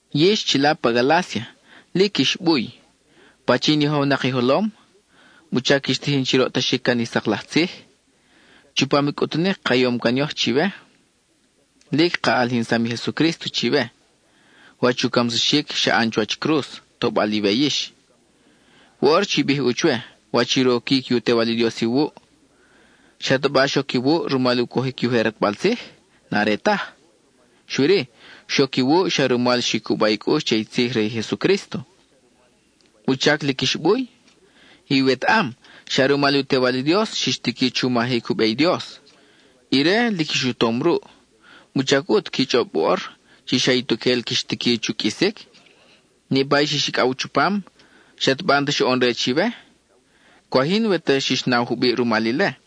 Yix chila pa Galácia, ¡lic ix buy! ¿Pachin yojownak i jolom? ¿Wuchac quix tijin chi roʼtaxic can i sak laj tzij? Chupam i cʼutunic ka ʼanom yoj chiwe, lic ka ʼalijinsam i Jesucrísto chiwe, wach u camsaxic xa ʼan chuwach cruz, tobal iwe yix. Woʼor chi bij ʼu chwe wach i roquic i u Tewal i Dios iwuʼ. ¿Xataba xoc iwuʼ rumal i u cojic i ujer ʼatbal tzij? N-are taj. Xui-ri, xoc iwuʼ xa rumal xi cuba i cʼux che i tzij re i Jesucrísto. ¿Wuchac lic ix buy? Iwetaʼam xa rumal i u Tewal i Dios xix tiqui chu majic u be i Dios; ire lic ix u tom ruʼ, ¿wuchac ʼut qui chʼob woʼor chi xa ituquel quix tiqui chu qʼuisic? Niʼpa i xix icʼaw chupam, ¿xataba n-ta xoʼon re chiwe? ¡Cwaj yin we ta xix naw jubiʼ rumal ile!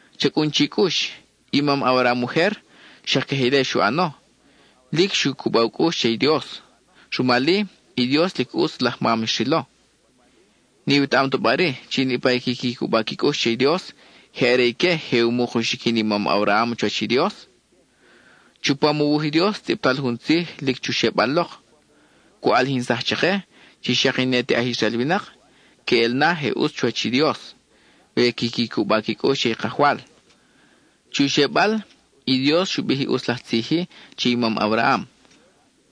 Cha cʼun chi cʼux, i mam Abraham ujer xak queje ile xu ʼano, lic xu cuba u cʼux che i Dios; rumal-i, i Dios lic ʼutz laj mam xrilo. ¿N-iwetaʼam ta bari chi niʼpa i quiqui cuba qui cʼux che i Dios, je are ique i je u muk u xiquin i mam Abraham chuwach i Dios? Chupam u wuj i Dios, tzʼibtal jun tzij lic chu xebal lok, cu ʼalijinsaj chake chi xak i ne te aj Israel winak queʼel na je ʼutz chuwach i Dios we quiqui cuba qui cʼux che i Kajwal. Chu xebal, i Dios xu bij i ʼutz laj tzij-i che i mam Abraham: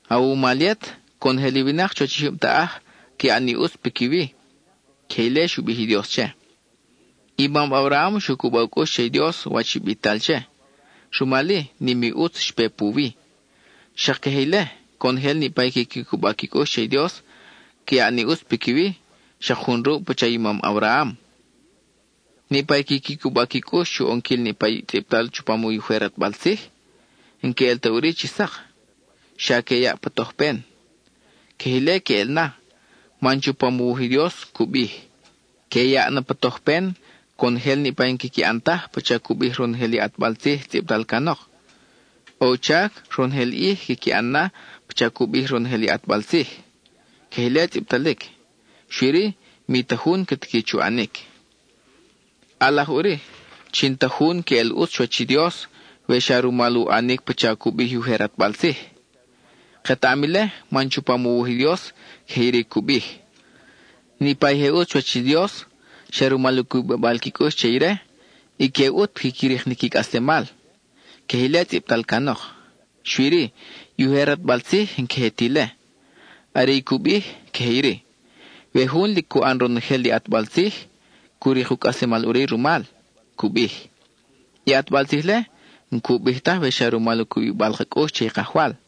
“Awumal yet, conojel i winak chuwach i jyub taʼaj ca yaʼ ni ʼutz piquiwi.” (Queje ile xu bij i Dios che.) I mam Abraham xu cuba u cʼux che i Dios, wach i bital che; rumal-i, nim i ʼutz xpe puwi. Xak queje ile, conojel niʼpa i quiqui cuba qui cʼux che i Dios, ca yaʼ ni ʼutz piquiwi, xak jun ruʼ pacha i mam Abraham. Niʼpa i quiqui cuba qui cʼux chu ʼonquil niʼpa i tzʼibtal chupam i ujer ʼatbal tzij, n-que ʼel ta ʼuri chi sak, xa que yaʼ pa tojpen. Queje ile queʼel na, man chupam u wuj i Dios cu bij: “Que yaʼ na pa tojpen conojel niʼpa i n-quiqui ʼan taj pacha cu bij ronojel i ʼatbal tzij tzʼibtal canok. ʼO u chac ronojel ʼij quiqui ʼan na pacha cu bij ronojel i ʼatbal tzij.” (Queje ile tzʼibtalic, xui-ri mi ta jun ca tiqui chu ʼanic.) ʼAlaj ʼuri chi n-ta jun queʼel ʼutz chuwach i Dios we xa rumal u ʼanic pacha cu bij i ujer ʼatbal tzij. Ketaʼam ile man chupam u wuj i Dios queje iri cu bij: “Niʼpa i je ʼutz chuwach i Dios xa rumal u cubibal qui cʼux che ire, ique ʼut quiqui rik ni qui cʼaslemal.” (Queje ile tzʼibtal canok.) Xui-ri, i ujer ʼatbal tzij n-queje ti ile. Are i cu bij, queje iri: “We jun lic cu ʼan ronojel i ʼatbal tzij, cu rik u cʼaslemal ʼuri rumal,” cu bij. I ʼatbal tzij-le n-cu bij taj we xa rumal i cubibal ka cʼux che i Kajwal.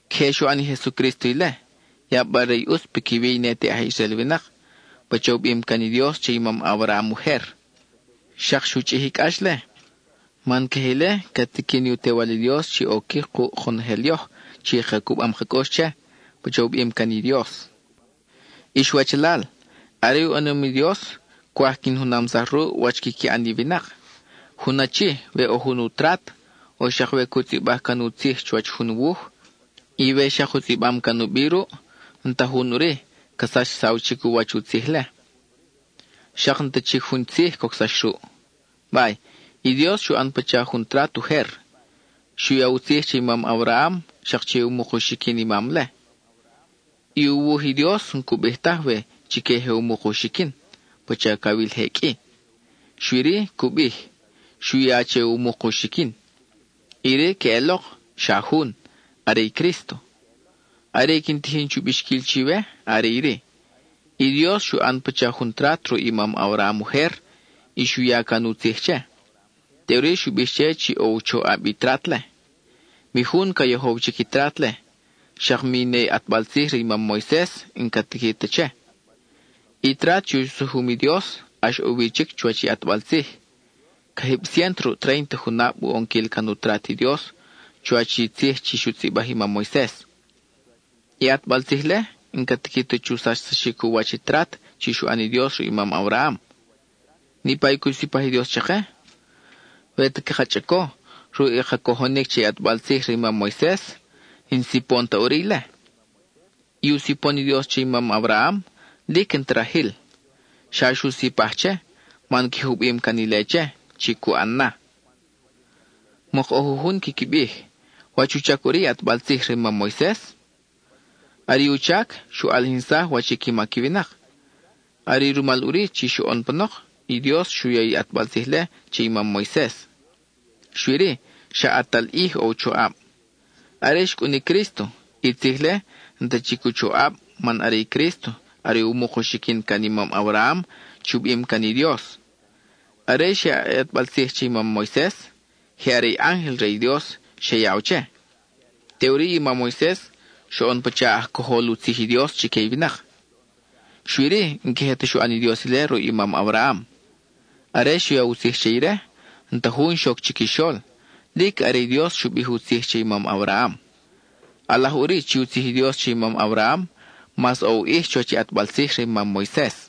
Queje xu ʼan i Jesucrísto ile, yabal re i ʼutz piquiwi i ne te aj Israel winak, pacha u bim can i Dios che i mam Abraham ujer. Xak xu chʼij i cʼax-le, man queje ile ca tiqui ni u Tewal i Dios chi oquic kuʼ konojel yoj chi ka cubam ka cʼux che, pacha u bim can i Dios. Ix wachalal, are u ʼanom i Dios, cwaj quin junamsaj ruʼ wach quiqui ʼan i winak: jun achi, we ʼo jun u trat, o xak we cu tzʼibaj can u tzij chuwach jun wuj, y we xak u tzʼibam can u bi ruʼ, n-ta jun ʼuri ca sachsaw chic u wach i u tzij-le, xak n-ta chic jun tzij cocsax ruʼ. Bay, i Dios xu ʼan pacha jun trat ujer. Xu ya u tzij che i mam Abraham, xak che u muk u xiquin i mam-le. I u wuj i Dios n-cu bij taj we “chique i je u muk u xiquin,” (pacha cawil je qʼui). Xui-ri, cu bij: “Xu ya che u muk u xiquin”. Iri queʼelok, xa jun; are i Crísto. Are i quin tijin chu bixquil chiwe are iri: i Dios xu ʼan pacha jun trat ruʼ i mam Abraham ujer y xu ya can u tzij che; teʼuri xu bij che chi ʼo u choʼab i trat-le. (Mi jun ca yojow chic i trat-le, xak mi ne i ʼatbal tzij re i mam Moises n-ca tiqui ta che.) I trat chi u sujum i Dios ʼax ʼo wi chic chuwach i ʼatbal tzij; cajib ciénto ruʼ tréinta junab u ʼonquil can u trat i Dios chuwach i tzij chi xu tzʼibaj i mam Moises. I ʼatbal tzij-le n-ca tiqui ta chu sachsaxic u wach i trat chi xu ʼan i Dios ruʼ i mam Abraham. Niʼpa i cu sipaj i Dios chake, we ta caka chʼaco ruʼ i ka cojonic che i ʼatbal tzij re i mam Moises, n-sipon ta ʼuri ile. I u sipon i Dios che i mam Abraham lic n-ta rajil, xa xu sipaj che man queje u bim can ile che chi cu ʼan na. Mok ʼo jujun quiqui bij, “¿Wach u chac ʼuri i ʼatbal tzij re i mam Moises?” Are i u chac, xu ʼalijinsaj wach i qui mac i winak. Are i rumal ʼuri chi xoʼon panok i Dios xu ya i ʼatbal tzij-le che i mam Moises; xui-ri, xa ʼatal ʼij ʼo u choʼab. Are xcʼun i Crísto, i tzij-le n-ta chic u choʼab man are i Crísto are “u muk u xiquin” can i mam Abraham chi u bim can i Dios. Are xyaʼ i ʼatbal tzij che i mam Moises, je are i ángel re i Dios xe yaw che, teʼuri i mam Moises xoʼon pacha aj cojol u tzij i Dios chique i winak. Xui-ri, n-queje ta xu ʼan i Dios ile ruʼ i mam Abraham. Are xu ya u tzij che ire, n-ta jun xoc chiquixol; lic are i Dios xu bij i u tzij che i mam Abraham. (ʼAlaj ʼuri chi u tzij i Dios che i mam Abraham mas ʼo u ʼij chuwach i ʼatbal tzij re i mam Moises.)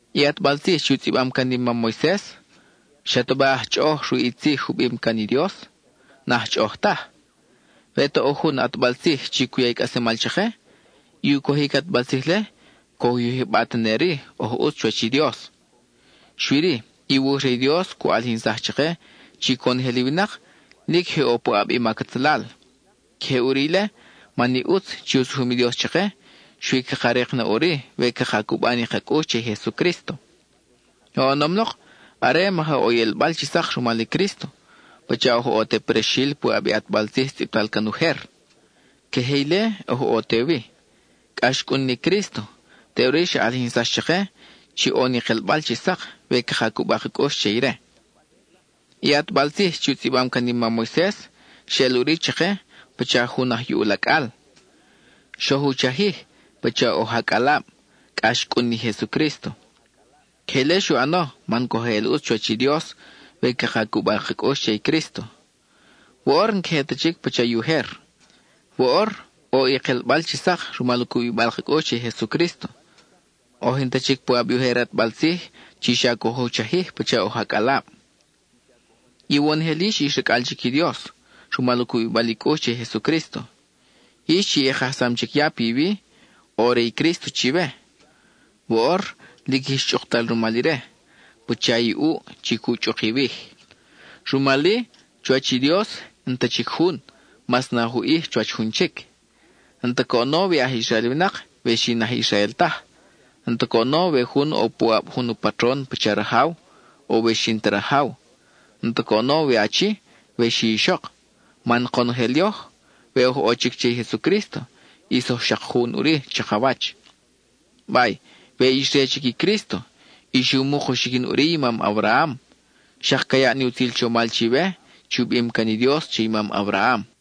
I ʼatbal tzij chi u tzʼibam can i mam Moises ¿xataba aj chʼoʼoj ruʼ i tzij u bim can i Dios? N-aj chʼoʼoj taj. We ta ʼo jun ʼatbal tzij chi cu ya i cʼaslemal chake, i u cojic i ʼatbal tzij-le coj u yijba tene-ri oj ʼutz chuwach i Dios. Xui-ri, i wuj re i Dios cu ʼalijinsaj chake chi conojel i winak lic je ʼo puʼab i mac atzalal. Queje ʼuri ile, man i ʼutz chi u sujum i Dios chake xui caka rik na ʼuri we caka cuba ni ka cʼux che i Jesucrísto. Oʼonom lok, are maja ʼo i ʼelbal chi sak rumal i Crísto, pacha oj ʼo te prexil puʼab i ʼatbal tzij tzʼibtal can ujer. Queje ile oj ʼo te wi, cʼa xcʼun ni i Crísto, teʼuri xa ʼalijinsax chake chi ʼo ni kelbal chi sak we caka cuba ka cʼux che ire. I ʼatbal tzij chi u tzʼibam can i mam Moises xeʼel ʼuri chake pacha jun aj yuʼul acʼal; xoj u chajij pacha oj acʼalab, cʼa xcʼun ni Jesucrísto. Queje ile xu ʼano man coj eʼel ʼutz chuwach i Dios we caka cuba ka cʼux che i Crísto. Woʼor, n-queje ta chic pacha i ujer. Woʼor ʼo i kelbal chi sak rumal u cubibal ka cʼux che i Jesucrísto. Oj n-ta chic puʼab i ujer ʼatbal tzij chi xa coj u chajij pacha oj acʼalab. Iwonojel yix ix racʼal chic i Dios, rumal u cubibal i cʼux che i Jesucrísto. Yix chi i kajsam chic ya piwi, ʼo re i Crísto chiwe; woʼor lic ix chʼuktal rumal ire, pacha i ʼuʼ chi cu chʼuk i iwij. Rumal-i, chuwach i Dios, n-ta chic jun mas naj u ʼij chuwach jun chic: n-ta coʼono we aj Israel winak, we xi n-aj Israel taj; n-ta coʼono we jun ʼo puʼab jun u patron pacha rajaw, we xi n-ta rajaw; n-ta coʼono we achi, we xi ixok; man konojel yoj, we oj ʼo chic che i Jesucrísto, ʼis oj xak jun ʼuri chakawach. Bay, we ix re chic i Crísto, ix u muk u xiquin ʼuri i mam Abraham; xak ca yaʼ ni utzil chomal chiwe chi u bim can i Dios che i mam Abraham.